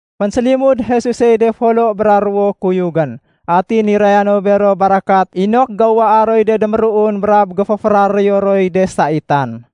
Fénsélimud Jesusey de folo bra ruwo kuyugén. Atin niraya no bero barakat inok géuwaa roy de déméruun brab géféféraréyo roy de saitan.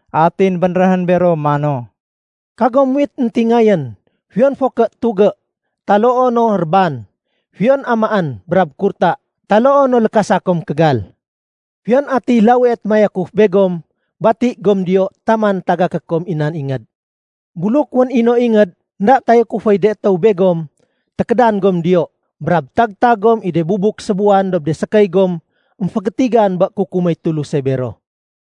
Atin bénréhén bero mano, “Kagom muwit éntingayén, fiyon fo ké tugé, taloo no réban, fiyon amaén, brab kurta, taloo no lékasa kom kégal. Fiyon atiy lawie témayakuf begom, bati gom diyo taman tagaké kom i nan ingéd. Buluk wén no ingéd énda tayakuféy de étéw begom, tékédan gom diyo, brab tag-tag gom i de bubuk sébuwan dob de sékéy gom émfégétigan bé kukuméy Tuluse bero.”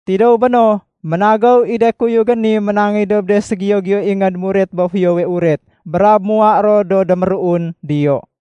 Tidéw béno, ménagéw i de kuyugén ni ménangéy dob de ségiyo-giyo ingéd muret bé Fiyowe Uret, brab muwa ro do déméruun diyo.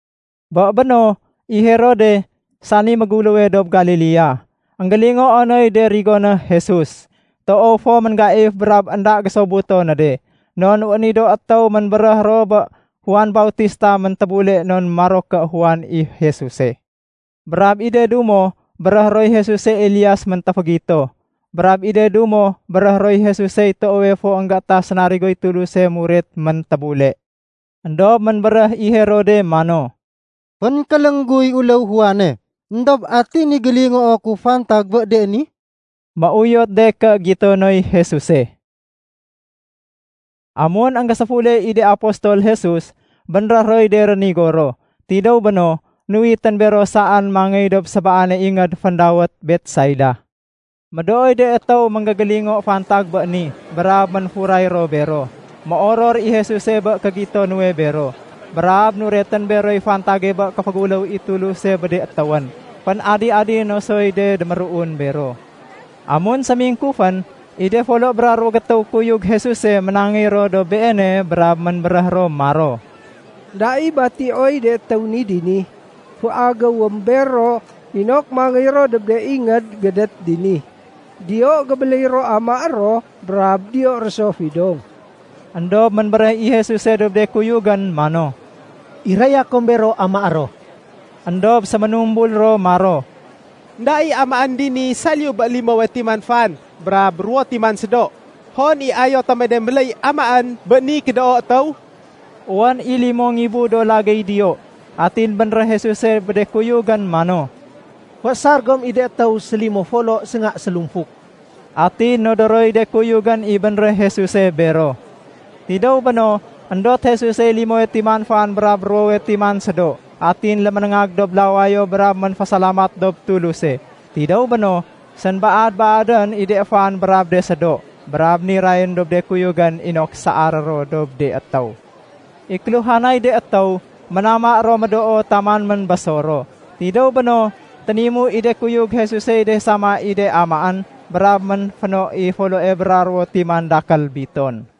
Bé béno, i Herode, sani méguléwe dob Galilea, énggélingoo noy de rigoné Jesuse. Toow fo ménggaif brab énda gésobuto no de, non wén i do étéw ménbéréh ro bé Juan Bautistawe méntébule non maro ké Juan i Jesuse. Brab i de dumo béréhé roy Jesuse Elias méntéfégito. Brab i de dumo béréhé roy Jesusey toowe fo énggétah sénarigoy Tuluse muret méntébule. Endob ménbéréh i Herode mano, “Fénkéléng guy uléw Juane. Endob ati ni gélingoo ku fantag bé de ni?” Méuyot de ké gito noy Jesuse. Amun énggéséfule i de apostol Jesus, bénréh roy de rénigo ro. Tidéw béno, nuwitén bero saén mangéy dob sébaane ingéd féndawét Betsaida. Médooy de étéw énggégélingo fantag bé ni brab ménfuray ro bero. Méoror i Jesuse bé kégito nuwe bero, brab nuretén beroy fantage bé kéféguléw i Tuluse bé de étéwén. Fén-adi-adi né soy de déméruun bero. Amun sémingkufén, i de folo bra ruwo gétéw kuyug Jesuse ménangéy ro dob Beene brab ménbéréh ro maro, “Enda i batioy de étéw ni dini. Féagéwém bero inok mangéy ro dob de ingéd gédét dini. Diyo gébéléy ro amaé ro brab diyo ro so fidong.” Endob ménbéréh i Jesuse dob de kuyugén mano, “Iraya kom bero amaé ro.” Endob séménumbul ro maro, “Enda i amaén dini saliyu bé limowe timan fan brab ruwo timan sédo. Hon i ayo tome de méléy amaén bé ni kédoo étéw?” (Wén i limo ngibu do lagéy diyo.) Atin bénréh Jesuse bé de kuyugén mano, “Féésar gom i de étéw sélimo folo sénga sélumfuk.” Atin nodoroy de kuyugén i bénréh Jesuse bero. Tidéw béno, éndot Jesusey limowe timan fan brab ruwowe timan sédo, atin léménéngag dob lawayo brab ménfésalamat dob Tuluse. Tidéw béno, sénbaad-baadén i de fan brab de sédo, brab nirayén dob de kuyugén inok saaré ro dob de étéw. I kéluhanay de étéw ménama ro médoo taman ménbésor ro. Tidéw béno, ténimu i de kuyug Jesusey de sama i de amaén brab ménféno i foloe bra ruwo timan dakél biton.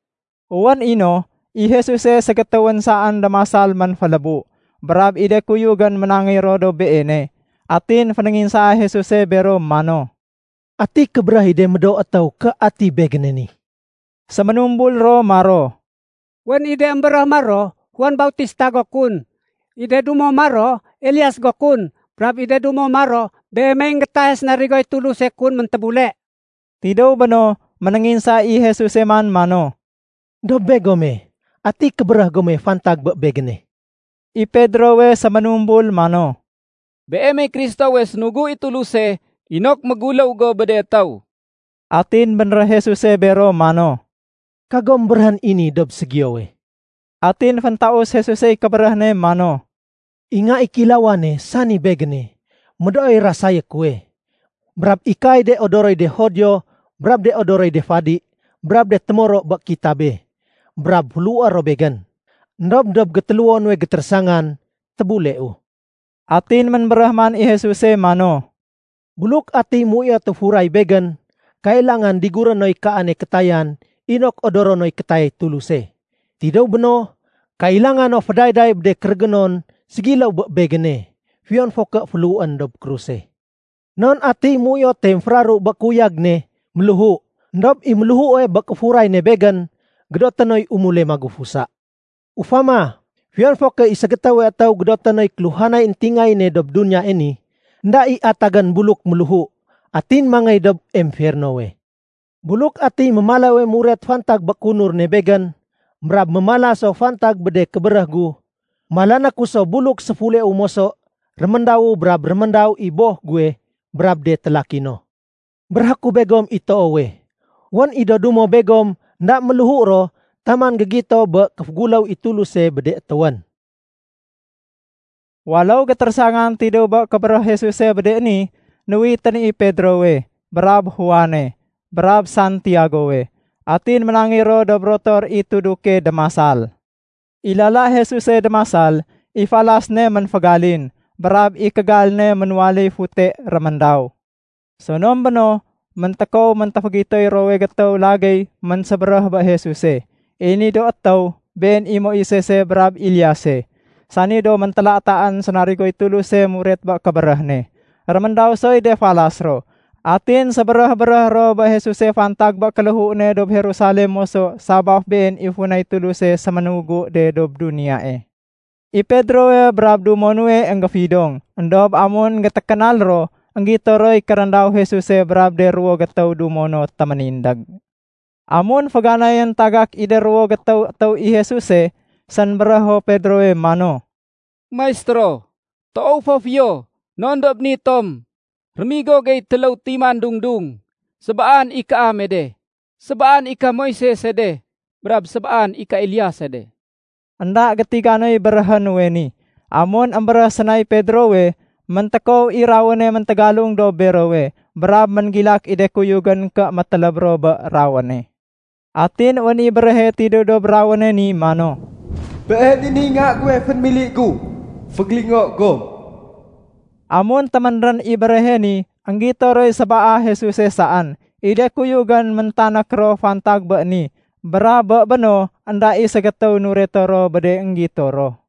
Wén i no, i Jesuse ségétéwén saén démasal ménfélébu. Brab i de kuyugén ménangéy ro dob Beene. Atin fénénginsaa Jesuse bero mano, “Ati kébéréh i de médoo étéw ké ati Begéne ni?” Séménumbul ro maro, “Wén i de émbéréh maro, Juan Bautista go kun. I de dumo maro, Elias go kun. Brab i de dumo maro, Beemey énggétahe sénarigoy Tuluse kun méntébule.” Tidéw béno, ménénginsa i Jesuse man mano, “Dob begome, ati kébéréh gome ‘fantag bé Begéne?’” I Pedrowe séménumbul mano, “Beemey Kristowe sénugu i Tuluse inok méguléw go bé de étéw.” Atin bénréh Jesuse bero mano, “Kagom béréhén i ni dob ségiyowe.” Atin féntaus Jesusey kébéréh ne mano, “I Nga i Kéilawane, sani Begéne, médooy rasayé kuwe. Brab ikaay de odoroy de Judio brab de odoroy de fadi brab de témoro bé kitabe, brab féléhué ro Begén. Endob dob gétéléwo nuwe gétérésangan, tébuleu.” Atin ménbéréh man i Jesuse mano, “Buluk atiy méuyote furay Begén, kailangan diguré noy kaane kétayan inok odoro noy kétayay Tuluse. Tidéw béno, kailanga no fédayday bé de kérégénon ségiléw bé Begéne, fiyon fo ké féléhuén dob kruse. Non atiy méuyote émféraru bé kéuyag ne, méléhu. Endob i méléhue bé kéfuray ne Begén, gédoté noy umule magufusa. Ufama, fiyon fo ké i ségétéwe étéw gédoté noy kéluhanay éntingayéne dob duniyae ni, énda i atagén buluk méléhu atin mangéy dob emfernowe. Buluk atiy mémalawe muret fantag bé kéunur ne Begén, brab mémala so fantag bé de kébéréh gu, malané ku so buluk séfuleu moso réméndawu brab réméndaw i Boh guwe brab de télaki no. Béréhé ku begom i toowe, wén i do dumo begom énda méléhu ro taman gégito bé kéféguléw i Tuluse bé de étéwén.” Waléw gétérésangan tidéw bé kébéréh Jesuse bé de ni, nuwitén i Pedrowe, brab Juane, brab Santiagowe, atin ménangéy ro dob rotor i tuduke démasal. I lala Jesuse démasal, i falas ne ménfégalin, brab i kégal ne ménwaléy fute réméndaw. Sonom béno, méntékow méntéfégitoy ruwowe gétéw lagéy ménsébéréh bé Jesuse. I ni do étéw, been i Moisese brab Eliase, sani do méntélataén sénarigoy Tuluse muret bé kébéréh ne. Réméndaw soy de falas ro. Atin sébéréh-béréh ro bé Jesuse fantag bé kéléhu ne dob Jerusalem moso sabaf been i funay Tuluse séménugu de dob duniyae. I Pedrowe brab dumo nuwe énggéfidong. Endob amun énggétékénal ro, énggito roy kéréndaw Jesuse brab de ruwo gétéw dumo no téménindég. Amun féganayén tagak i de ruwo gétéw étéw i Jesuse, sénbérého Pedrowe mano, “Maistéro, toow fo fiyo non dob ni tom. Rémigo gey téléw timan dung-dung. Sébaan i kaame de, sébaan i ka Moisese de, brab sébaan i ka Eliase de.” (Enda gétiga noy béréhé nuwe ni.) Amun émbéréh sénay Pedrowe, méntékow i rawéne méntégalung dob berowe. Brab ménggilak i de kuyugén ké météléb ro bé rawéne. Atin wén i béréhe tidéw dob rawéne ni mano, “Been i niy Nga guwe fénémili gu. Fégélingo gom.” Amun téménrén i béréhe ni, énggito roy sébaa Jesuse saén. I de kuyugén méntanék ro fantag bé ni, brab bé béno énda i ségétéw nureto ro bé de énggito ro.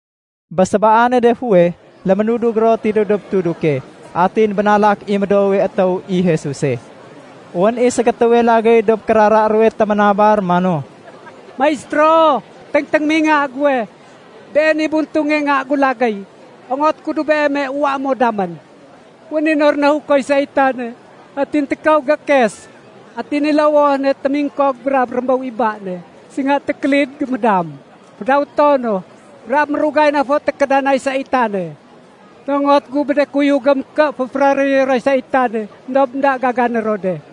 Bé sébaane de fuweh, léménudug ro tidéw dob tuduke, atin bénalak i médoowe étéw i Jesuse. Wén i ségétéwe lagéy dob kérara ruwe téménabar mano, “Maistéro, téngténgém i nga guwe. Been i buntunge nga gu lagéy. Ongoté ku dob Beeme uwaé mo damén. Wén i no rahukoy saitane, atin tékow gékes. Atin i lowoh ne témingkog brab rémbéw i ba ne. Sénga tékélid gémédam, fédawéto no, brab mérugay na fo tékédanay saitane. Nongot gu bé de kuyugém ké féféraréyé roy saitane, éndob énda gagané ro de.”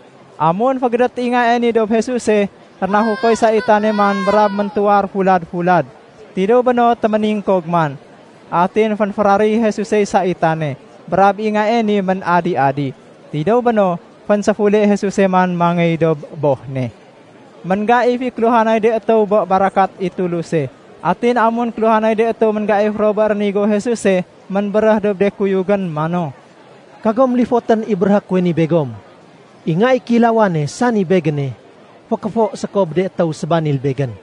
Amun fégédét i ngae ni dob Jesuse, rénahukoy saitane man brab méntuwar fulad-fulad. Tidéw béno téméningkog man. Atin fénféraréy Jesusey saitane, brab i ngae ni ménadi-adi. Tidéw béno, fénséfule Jesuse man mangéy dob boh ne. Ménggaif i kéluhanay de étéw bé barakat i Tuluse. Atin amun kéluhanay de étéw ménggaif ro bé no rénigo Jesuse, ménbéréh dob de kuyugén mano, “Kagom lifotén i béréhé kuwe ni begom. I Nga i Kéilawane, sani Begéne, fékéfo séko bé de étéw sébanil Begén.”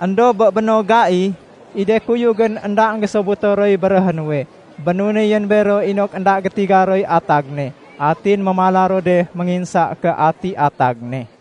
Endob bé béno gai, i de kuyugén énda énggésobuto roy béréhé nuwe. Bénunéyén bero inok énda gétiga roy atag ne. Atin mémala ro de ménginsa ké ati atag ne.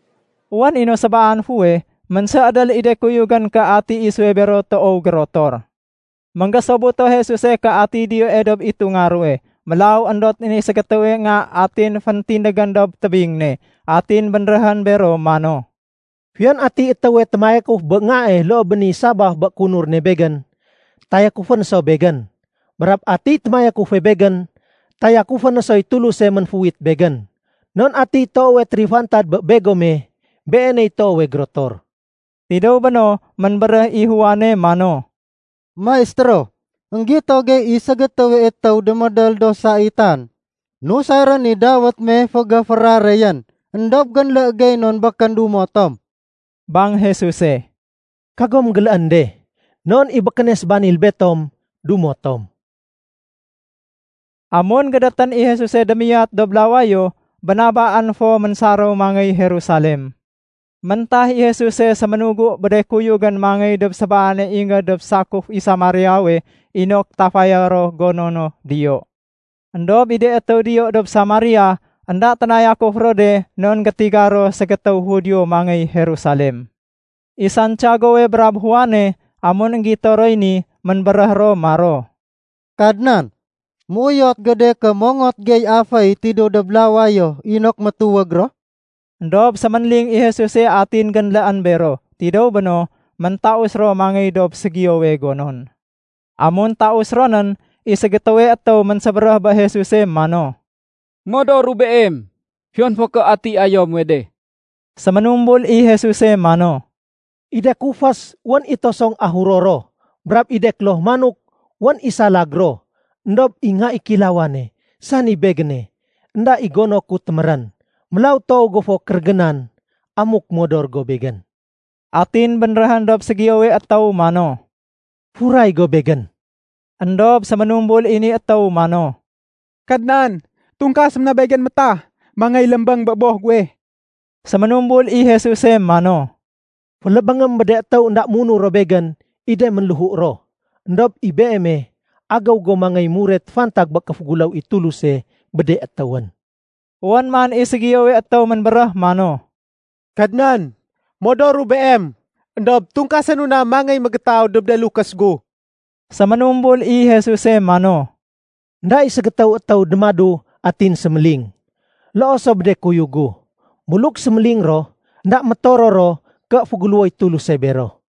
Wén i no sébaan fuweh, ménséédél i de kuyugén ké ati isuwe bero toow gérotor. Enggésobuto Jesuse ké atiy diyoe dob itunga ruwe. Mélaw éndotén i ségétéwe nga atin féntindégén dob tébing ne. Atin bénréhén bero mano, “Fiyon atiy étéwe témayakuf bé ngae loo bé ni sabaf bé kéunur ne Begén, tayakufé no so Begén. Brab atiy témayakufe Begén, tayakufé no soy Tuluse ménféuwit Begén. Non atiy toowe térifantad bé begome, beeney toowe gérotor.” Tidéw béno, ménbéréh i Juane mano, “Maistéro, énggito gey i ségétéwe étéw démédél do saitan nusarén i dawét me fégéféraréyén. Endob génlé gey non békén dumo tom.” Bang Jesuse, “Kagom géléén de. Non i békéne sébanil betom, dumo tom.” Amun gédétén i Jesuse démiyat dob lawayo, bénabaén fo ménsaréw mangéy Jerusalem. Méntah i Jesuse séménugu bé de kuyugén mangéy dob sébaane ingéd dob sakuf i Samariawe inok tafaya ro gono no diyo. Endob i de étéw diyo dob Samaria, énda ténayakuf ro de non gétiga ro ségétéw Judio mangéy Jerusalem. I Santiagowe brab Juane, amun énggito roy ni, ménbéréh ro maro, “Kadnan, méuyot go de ké mongot gey aféy tidéw dob lawayo inok métuwég ro?” Endob séménling i Jesuse atin génléén bero. Tidéw béno, méntaus ro mangéy dob ségiyowe gonon. Amun taus ro nén, i ségétéwe étéw ménsébéréh bé Jesuse mano, “Modoru Beem, fiyon fo ké ati ayo muwe de.” Séménumbul i Jesuse mano, “I de kufés, wén i tosong ahuro ro. Brab i de kloh manok, wén i salag ro. Endob i Nga i Kéilawane, sani Begéne, énda i gono ku témérén. Mélaw toow go fo kérégénan amuk modor go Begén.” Atin bénréhén dob ségiyowe étéw mano, “Furay go Begén.” Endob séménumbul i ni étéw mano, “Kadnan, tungkasém na begén métah mangéy lémbéng bé boh guwe.” Séménumbul i Jesuse mano, “Félébéngém bé de étéw énda munur ro Begén i de ménléhu ro. Endob i beeme, agéw go mangéy muret fantag bé kéféguléw i Tuluse bé de étéwén.” Wén man i ségiyowe étéw ménbéréh mano, “Kadnan, modoru Beem. Endob tungkasénu na mangéy mégétaw dob de lukés gu.” Séménumbul i Jesuse mano, “Enda i ségétéw étéw démadu atin séméling. Loo so bé de kuyug gu. Buluk séméling ro, énda métoror ro ké féguléwoy Tuluse bero.”